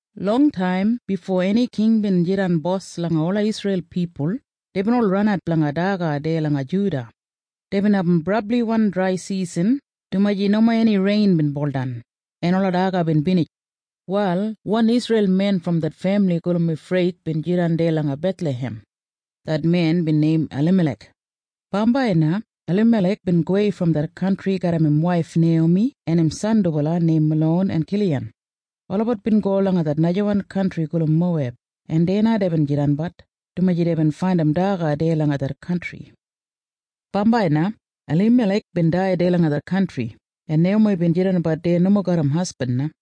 Longtaim bifo eni king bin jidan bos langa ola Isreil pipul, deibin ol ranat blanga daga deya langa Juda. Deibin abum brabliwan draisisan, dumaji nomo eni rein bin buldan, en ola daga bin binij. Wal wan Isreil men brom det femili gulum Efrath bin jidan deya langa Bethlahem. Det men bin neim Alimalek. Bambai na Alimalek bin gowei brom det kantri garram im waif Neiyomi en im san dubala neim Malon en Kiliyan. Olabat bin go langa najawan kantri gulum Moweb, en deya na deibin jidanbat, dumaji deibin faindim daga deya langa det kantri. Bambai na Alimalek bin dai deya langa det kantri, en Neiyomi bin jidanbat deya nomo garram hasbin na.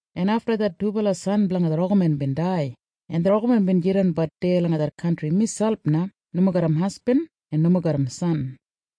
en afta det dubala san blanga det olgamen bin dai, en det olgamen bin jidanbat deya langa det kantri miselp na nomo garram hasbin en nomo garram san.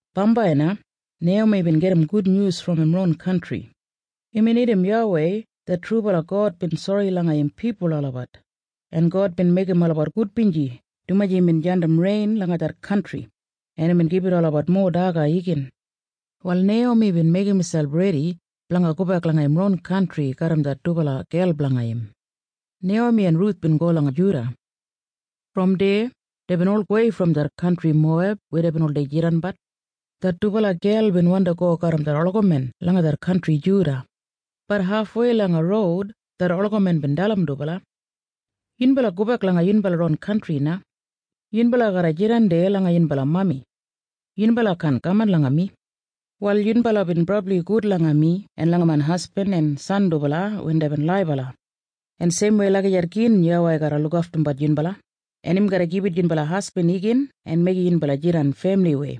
Bambai na Neiyomi bin gedim gudnyus brom im ron kantri. Imbin irrim YAWEI det trubala God bin sori blanga im pipul olabat, en God bin meigim olabat gudbinji dumaji imbin jandim rein langa det kantri, en imbin gibit olabat mowa daga igin. Wal Neiyomi bin meigim miselp redi blanga gobek langa im ron kantri. Det olgamen bin go garram det dubala dedbala san waif dubala. Brom deya deibin ol gowei brom det kantri Moweb weya deibin oldei jidanbat. Det dubala gel bin wandi go garram det olgamen langa det kantri Juda. Bat hafwei langa roud det olgamen bin dalim dubala. “Yunbala gobek langa yunbala ron kantri na. Yunbala garra jidan deya langa yunbala mami. Yunbala kaan kaman langa mi. “Wal yunbala bin brabli gud langa mi en langa main hasbin en san dubala wen deibin laibala. En seimwei lagijat gin YAWEI garra lukaftumbat yunbala, en im garra gibit yunbala hasbin igin en meigim yunbala jidan femiliwei.”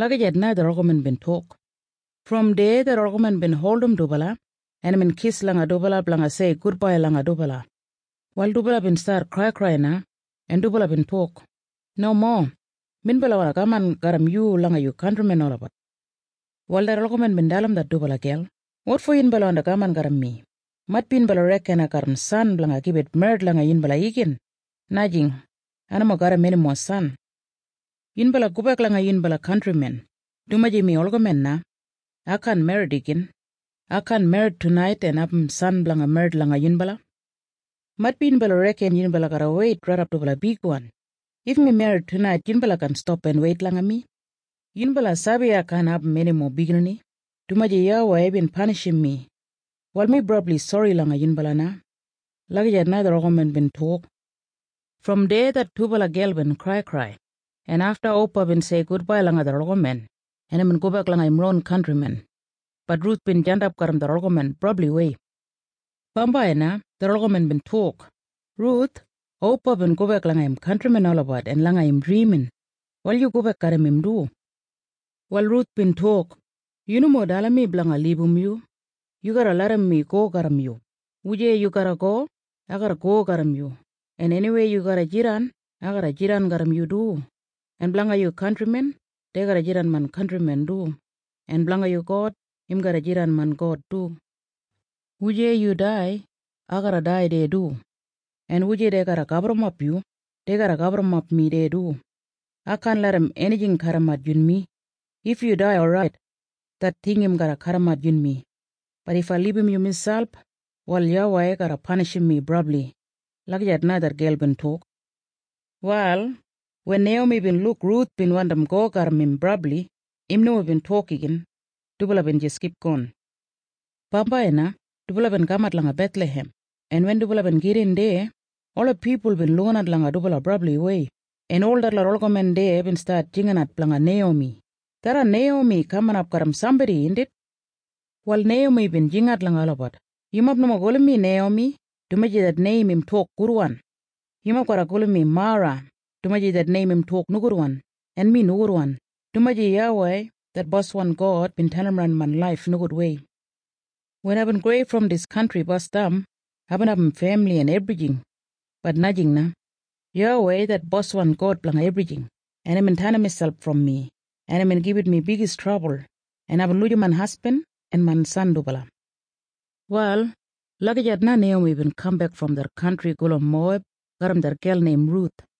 Lagijat na det olgamen bin tok. Brom deya det olgamen bin holdim dubala, en imbin kis langa dubala blanga sei gudbai langa dubala. Wal dubala bin stat kraikrai na, en dubala bin tok, “Nomo! Minbala wandi kaman garram yu langa yu kantrimen olabat.” Wal det olgamen bin dalim det dubala gel, “Wotfo yunbala wandi kaman garram mi? Maitbi yunbala reken ai garram san blanga gibit merrit langa yunbala igin? Najing. Ai nomo garram enimo san. Yunbala gobek langa yunbala kantrimen, dumaji mi olgamen na. Ai kaan merrit igin. Ai kaan merrit tunait en abum san blanga merrit langa yunbala. Maitbi yunbala reken yunbala garra weit raidap dubala bigwan? If mi merrit tunait, yunbala kaan stap en weit langa mi. Yunbala sabi ai kaan abum enimo biginini, dumaji YAWEI bin panishim mi. Wal mi brabli sori langa yunbala na.” Lagijat na det olgamen bin tok. Brom deya det dubala gel bin kraikrai, en afta Opa bin sei gudbai langa det olgamen, en imbin gobek langa im ron kantrimen. Bat Ruth bin jandap garram det olgamen brabliwei. Bambai na det olgamen bin tok, “Ruth, Opa bin gobek langa im kantrimen olabat en langa im drimin. Wal yu gobek garram im du.” Wal Ruth bin tok, “Yu nomo dalim mi blanga libum yu. Yu garra larram mi go garram yu. Wujei yu go, ai garra kaman garram yu, en eniweya yu garra jidan, ai garra jidan garram yu du. En blanga yu kantrimen, dei garra jidan main kantrimen du. En blanga yu God, im garra jidan main God du. Wujei yu dai, ai garra dai deya du. En wujei dei garra gaburrumap yu, dei garra gaburrumap mi deya du. Ai kaan larram enijing kadimat yunmi. If yu dai, orait. Det ting im garra kadimat yunmi. Bat if ai libum yu miselp, wal YAWEI garra panishim mi brabli.” Lagijat na det gel bin tok. Wal wen Neiyomi bin luk Ruth bin wandim go garram im brabli, im nomo bin tok igin. Dubala bin jis kipgon. Bambai na dubala bin kamat langa Bethlahem. Ola pipul bin lukinat langa dubala brabliwei, en ol detlot olgamen deya bin stat jinginat blanga Neiyomi, “Tharran Neiyomi kaminap garram sambodi, indit?” Wal Neiyomi bin jingat langa olabat, “Yumob nomo gulum mi Neiyomi, dumaji det neim im tok gudwan. Yumob garra gulum mi Mara, dumaji det neim im tok nogudwan, en mi nogudwan, dumaji YAWEI det boswan God bin tenimran main laif nogudwei. Wen aibin gowei brom dis kantri basdam, aibin abum femili en ebrijing. Bat najing na. YAWEI det boswan God blanga ebrijing, en imbin tenim imselp brom mi, en imbin gibit mi bigis trabul, en aibin lujim main hasbin en main san dubala.” Wal lagijat na Neiyomi bin kambek brom det najawan kantri gulum Moweb garram det gel neim Ruth.